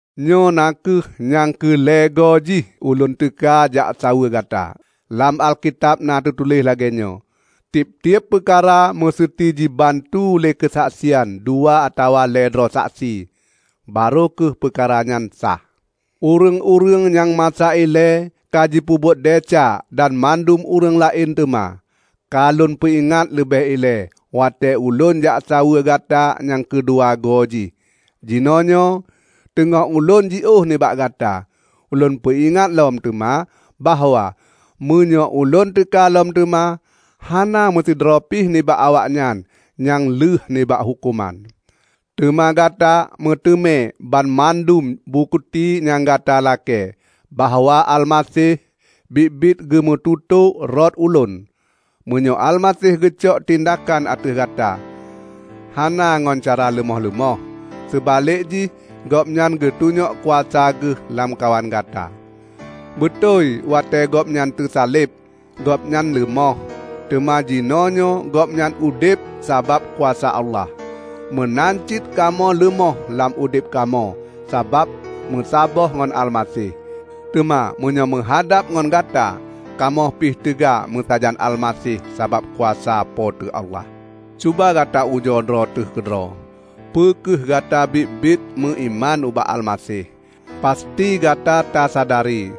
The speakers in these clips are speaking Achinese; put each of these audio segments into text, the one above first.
Nyoe na kheueh nyang keu lhée goe jih ulôn teuka jaksaweue gata. Lam Alkitab na teutuléh lagée nyoe, "Tieb-tieb peukara meuseuti jibantu lé keusaksian dua atawa lhée droe saksi, barô kheueh peukara nyan sah." Ureuëng-ureuëng nyang masa ilée ka jipeubuet desya dan mandum ureuëng laén teuma, ka lôn peuingat leubeh ilée watée ulôn jaksaweue gata nyang keudua goe jih. Jinoenyoe, teungoh ulôn jiôh nibak gata, ulôn peuingat lom teuma bahwa meunyoe ulôn teuka lom teuma, hana meusidroe pih nibak awaknyan nyang lheueh nibak huköman. Teuma gata meuteumé banmandum bukeuti nyang gata lakée bahwa Almaseh biet-biet geumeututoe rot ulôn. Meunyoe Almaseh geucok tindakan ateueh gata, hana ngon cara leumoh-leumoh, seubalek jih Gobnyan geutunyok kuasa geuh lamkawan gata. Beutôi watée Gobnyan teusaleb, Gobnyan leumoh, teuma jinoenyoe Gobnyan udeb sabab kuasa Allah. Meunan cit kamoe leumoh lam udeb kamoe sabab meusaboh ngon Almaseh, teuma meunyoe meuhadab ngon gata, kamoe pih teuga meusajan Almaseh sabab kuasa Po teu Allah. Cuba gata ujoe droe teuh keudroe peu kheueh gata biet-biet meuiman ubak Almaseh! Pasti gata tasadari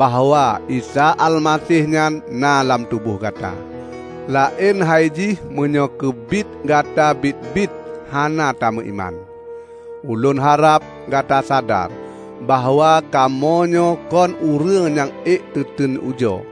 bahwa Isa Almaseh nyan na lam tuboh gata! -- laén hai jih meunyoe keubiet gata biet-biet hana tameuiman. Ulôn harab gata sadar bahwa kamoenyoe kon ureuëng nyang ék teuteun ujoe.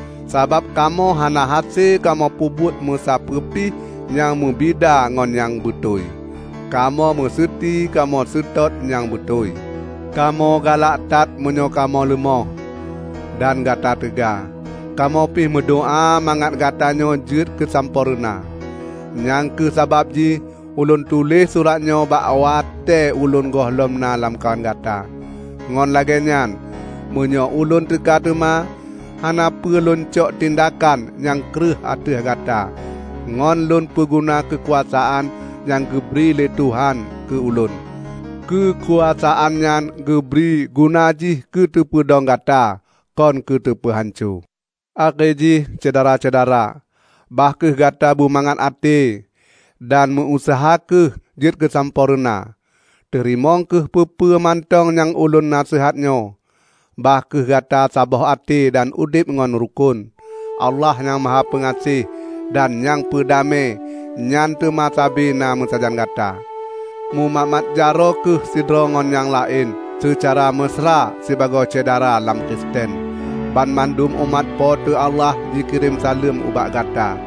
Sabab kamoe hana hase kamoe peubuet musapeue pih nyang meubida ngon nyang beutôi; kamoe meuseuti kamoe seutôt nyang beutôi. Kamoe galak that meunyoe kamoe leumoh, dan gata teuga. Kamoe pih meudoá mangat gatanyoe jeuet keusampoereuna. Nyang kheueh sabab jih ulôn tuléh surat nyoe bak watée ulôn gohlom na lamkawan gata. Ngon lagée nyan, meunyoe ulôn teuka teuma, hana peue lôn cok tindakan nyang kreueh ateueh gata ngon lôn peuguna keukuasaan nyang geubri lé Tuhan keu ulôn. Keukuasaan nyan geubri guna jih keu teupeudong gata, kon keu teupeuhanco. Akhé jih, Syedara-syedara, bah kheueh gata bumangat até, dan meu useuha kheueh jeuet keusampoe reuna. Teurimong kheueh peue-peue mantong nyang ulôn naseuhat nyoe. Bah kheueh gata saboh até dan udeb nyang rukon. Allah Nyang Mahapeugaséh dan nyang peudamé nyan teuma sabe na meusajan gata. Mumat-mat jaroe kheueh sidroe ngon nyang laén seucara meusra sibagoe syedara lam Kristen. Banmandum umat Po teu Allah jikirém saleuem ubak gata.